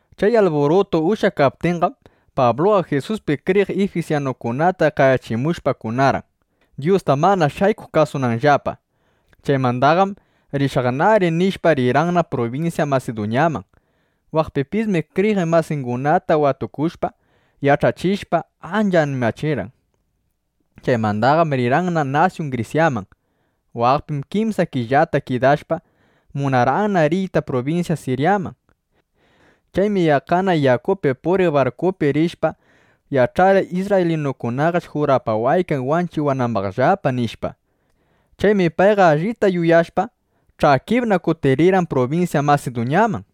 Chay alburutu ushyakaptinqam, Pabluqa Jisuspi kriyiq ifisyanukunata qayachimushpa kunarqan, Dyusta mana shaykuq kasunanllapa. Chaymandaqam “Rishaqnari”, nishpa, rirqanna prubinsya Masiduñaman. Waqpipismi kriyiq masingunata watukushpa, yach'achishpa, ancha animachirqan. Chaymandaqam rirqanna nasyun Grisyaman. Waqpim kimsa killata kidashpa, munarqanna riyta prubinsya Siryaman. Chaymi yaqqana yakupi puriq barkupi rishpa, yach'arqan: Isrraylinukunaqash jurapawaykan wanchiwanambaqllapa, nishpa. Chaymi payqa allita yuyashpa, ch'akipna kutirirqan prubinsya Masiduñaman.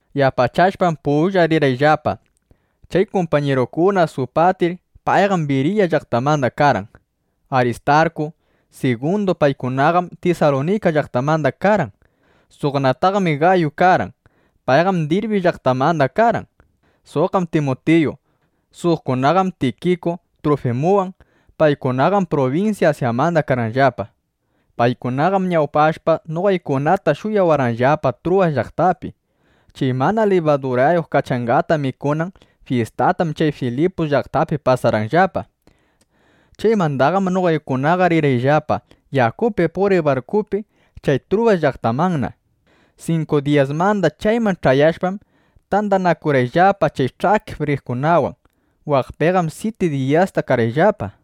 Yapachashpam pullan rirqanllapa kay kumpañirukuna: Supatir; payqam Biriya llaqtamanda karqan; Aristarku, Sigundu. Paykunaqam Tisalunika llaqtamanda karqan. Suqnataqmi Gayu karqan. Payqam Dirbi llaqtamanda karqan. Suqqam Timutiyu. Suqkunaqam Tikiku, Trufimuwan. Paykunaqam prubinsya Asyamanda karqanllapa. Paykunaqam ñawpashpa, noqaykunata shuyawarqanllapa Truwas llaqtapi. Chay mana libadurayuq kachangata mikunan fyistatam chay Filipus llaqtapi pasarqayllapa. Chaymandaqam noqaykunaqa rirqayllapa yakupi puriq barkupi chay Truwas llaqtamanna. Sinku diyasmanda chayman ch'ayashpam, tandanakurqayllapa chay ch'akip riqkunawan. Waqpiqam syiti diyasta karqayllapa.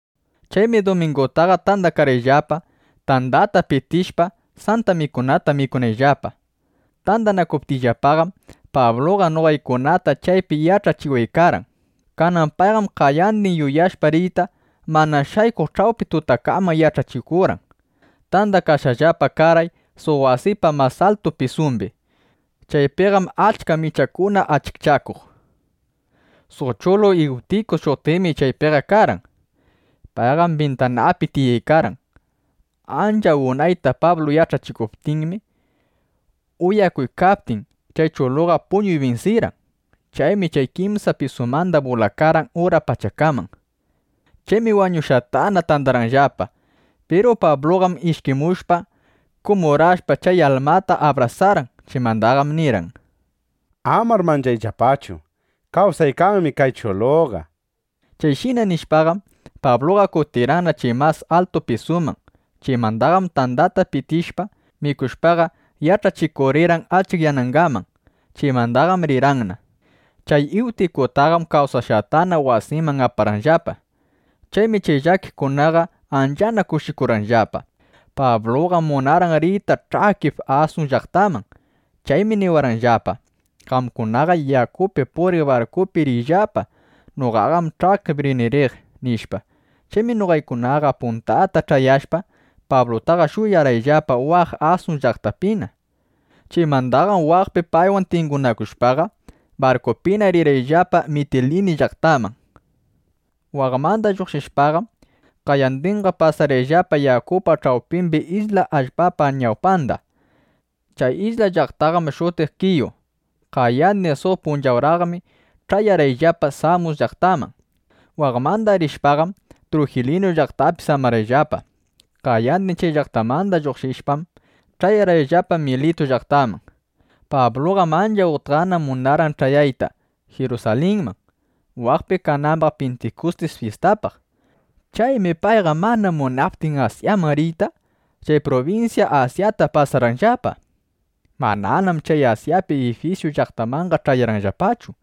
Chaymi dumingutaqa tandakarqayllapa, tandata pitishpa, Santa Mikunata mikunayllapa. Tandakaptiyllapaqam, Pabluqa noqaykunata chaypi yach'achiwaykarqan. Kanan payqam qayandin yuyashpa riyta, mana shaykuq ch'awpi tutakaman yach'achikurqan. Tandakashqallapa karqay suq wasipa mas altu pisumbi. Chaypiqam achka michakuna achikchakuq. Suq chulu Iwtiku shutiqmi chaypiqa karqan. Payqam bintanapi tiyaykarqan. Ancha unayta Pablu yach'achikuptinmi, uyakuykaptin, chay chulutaqa puñuy binsirqan. Chaymi chay kimsa pisumanda bulakarqan ura pachakaman. Chaymi wañushqatana tandarqanllapa. Piru Pabluqam ishkimushpa, kumurashpa, chay almata abrasarqan. Chaymandaqam nirqan: —Amar manchayllapachu. Kawsaykanmi kay chuluqa, nishpa. Chayshina nishpaqam, Pabluqa kutirirqanna chay mas altu pisuman. Chaymandaqam tandata pitishpa, mikushpaqa, yach'achikurirqan achikyanangaman. Chaymandaqam rirqanna. Chay Iwtikutaqam kawsaqtana wasinman aparqanllapa. Chaymi chay llakiqkunaqa anchana kushikurqanllapa. Pabluqam munarqan riyta ch'akip Asun llaqtaman. Chaymi niwarqanllapa: —Qamkunaqa yakupi puriq barkupi riyllapa. Noqaqam ch'akip rini riq, nishpa. Chaymi noqaykunaqa puntata ch'ayashpa, Pablutaqa shuyarqayllapa waq Asun llaqtapina. Chaymandaqam waqpi paywan tingunakushpaqa, barkupina rirqayllapa Mitilini llaqtaman. Waqmanda lluqshishpaqam, qayandinqa pasarqayllapa yakupa ch'awpimbi isla allpapa ñawpanda. Chay isla allpaqam shutiq Kiyu. Qayandin suq punchawraqmi ch'ayarqayllapa Samus llaqtaman. Waqmanda rishpaqam, Trojiliyu llaqtapi samarqayllapa. Qayandin chay llaqtamanda lluqshishpam, ch'ayarqayllapa Militu llaqtaman. Pabluqam ancha utqana munarqan ch'ayayta Jirusalinman, waqpi kanambaq Pintikustis fyistapaq. Chaymi payqa mana munaptin Asyaman riyta, chay prubinsya Asyata pasarqayllapa. Mananam chay Asyapa Ifisu llaqtanmanqa ch'ayarqayllapachu.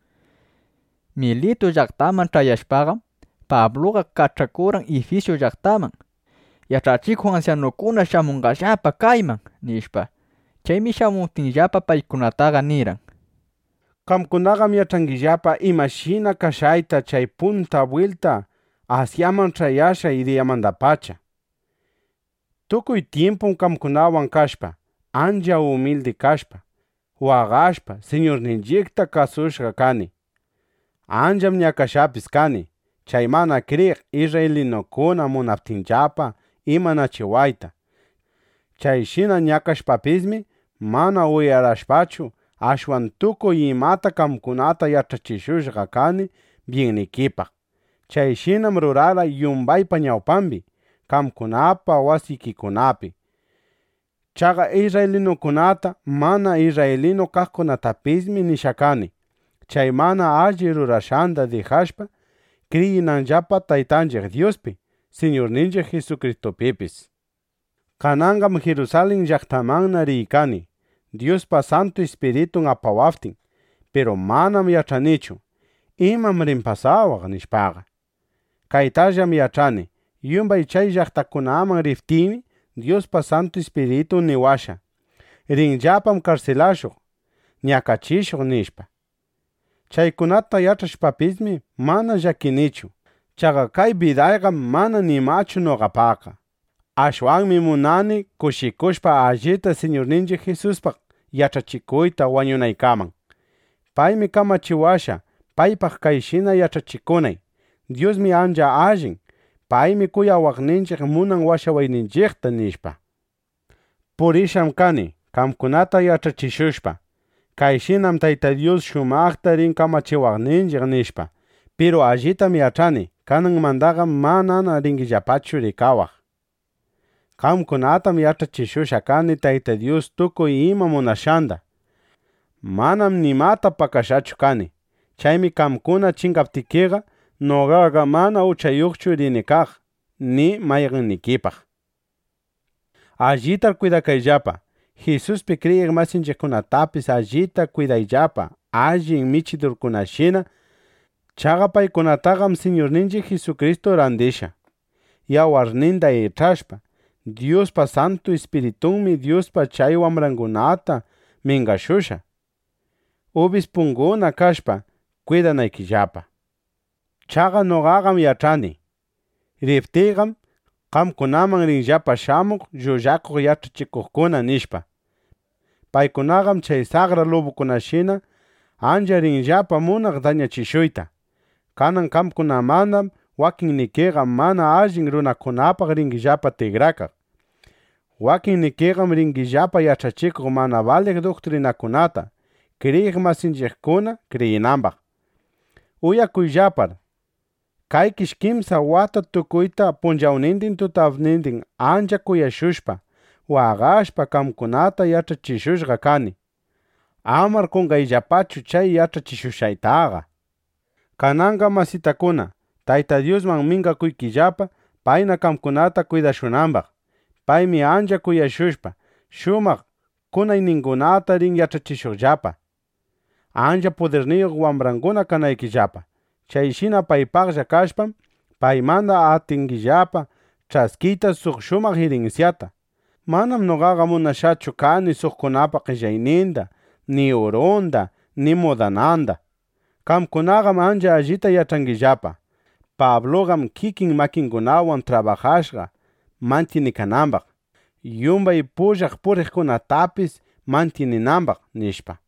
Militu llaqtaman ch'ayashpaqam, Pabluqa kach'akurqan Ifisu llaqtaman: —Yach'achikuq ansyanukuna shamunqallapa kayman, nishpa. Chaymi shamuptinllapa, paykunataqa nirqan: —Qamkunaqam yach'angillapa imashina kashqayta chay punta bwilta Asyaman ch'ayashqay diyamandapacha. Tukuy tyimpum qamkunawan kashpa, ancha umildi kashpa, waqashpa, Siñurninchiqta kasushqa kani. Ancham ñakashqapis kani, chay mana kriyiq isrraylinukuna munaptinllapa imanachiwayta. Chayshina ñakashpapismi, mana uyarashpachu, ashwan tukuy imata qamkunata yach'achishushqa kani byinnikipaq. Chayshinam rurarqay yumbaypa ñawpambi, qamkunapa wasikikunapi. Chaqa isrraylinukunata, mana isrraylinu kaqkunatapismi nishqana kani, chay mana alli rurashqanda dijashpa, kriyinanllapa Taytanchiq Dyuspi, Siñurninchiq Jisukristupipis. Kananqam Jirusalin llaqtamanna riykani, Dyuspa Santu Ispiritun apawaptin. Piru manam yach'anichu: ¿Imam rin pasawaq? nishpaqa. Kaytallam yach'ani: Yumbay chay llaqtakunaman riptiymi, Dyuspa Santu Ispiritun niwashqa: Rinllapam karsilashuq, ñakachishuq, nishpa. Chaykunata yach'ashpapismi, mana llakinichu. Chaqa kay bidayqam mana nimachu noqapaqqa. Ashwanmi munani, ˻kushikushpa˼ allita Siñurninchiq Jisuspaq yach'achikuyta wañunaykaman. Paymi kamachiwashqa, paypaq kayshina yach'achikunay: Dyusmi ancha allin. Paymi kuyawaqninchiq munan washawayninchiqta, nishpa. ’Purishqam kani, qamkunata yach'achishushpa: Kayshinam Tayta Dyus shumaqta rin kamachiwaqninchiq, nishpa. Piru allitam yach'ani: Kananmandaqam manana ringillapachu rikawaq. Qamkunatam yach'achishushqa kani Tayta Dyus tukuy ima munashqanda. Manam nimata pakashqachu kani. Chaymi qamkuna chingaptikiqa, noqaqa mana uchayuqchu rini kaq ni mayqannikipaq. Allitar kwidakayllapa. Jisuspi kriyiq masinchiqkunatapis allita kwidayllapa allin michidurkunashina. Chaqa paykunataqam Siñurninchiq Jisukristu randishqa, yawarninda ich'ashpa. Dyuspa Santu Ispiritunmi Dyuspa chay wambrangunata mingashushqa, ubispunguna kashpa, kwidanaykillapa. Chaqa noqaqam yach'ani: Riptiyqam, qamkunaman rinllapa shamuq llullakuq yach'achikuqkuna, nishpa. Paykunaqam chay saqra lubukunashina ancha rinllapa munaq dañachishuyta. Kanan qamkunamandam wakinnikiqa mana allin runakunapaq ringillapa tikrakaq. Wakinnikiqam ringillapa yach'achikuq mana baliq duktrinakunata, kriyiq masinchiqkuna kriyinambaq. Uyakuyllapar, kaykish kimsa wata tukuyta punchawnindin tutapnindin ancha kuyashushpa, waqashpa, qamkunata yach'achishushqa kani. ¡Amar qonqayllapachu chay yach'achishushqaytaqa! ’Kananqa masitakuna, Tayta Dyusman mingakuykillapa, payna qamkunata kwidashunambaq. Paymi ancha kuyashushpa, shumaq kunayningunata rin yach'achishuqllapa, ancha pudirniyuq wambranguna kanaykillapa. Chayshina paypaqlla kashpam, paymanda atingillapa ch'askiyta suq shumaq irinsyata. Manam noqaqa munashqachu kani suqkunapa qellayninda ni urunda ni mudananda. Qamkunaqam ancha allita yach'angillapa: Pabluqam kikin makingunawan trabajashqa mantyinikanambaq, yumbay pullan puriqkunatapis mantyininambaq, nishpa.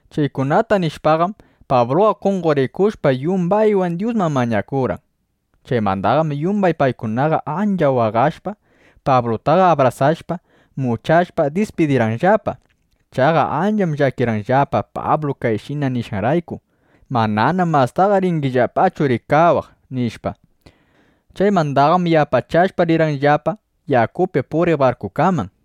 Chaykunata nishpaqam, Pabluqa qonqorikushpa, yumbaywan Dyusman mañakurqan. Chaymandaqam yumbay paykunaqa ancha waqashpa, Pablutaqa abrasashpa, muchashpa, dispidirqanllapa. Chaqa ancham llakirqanllapa Pablu kayshina nishqanrayku: “Mananam mastaqa ringillapachu rikawaq”, nishpa. Chaymandaqam yapachashpa, rirqanllapa yakupi puriq barkukaman.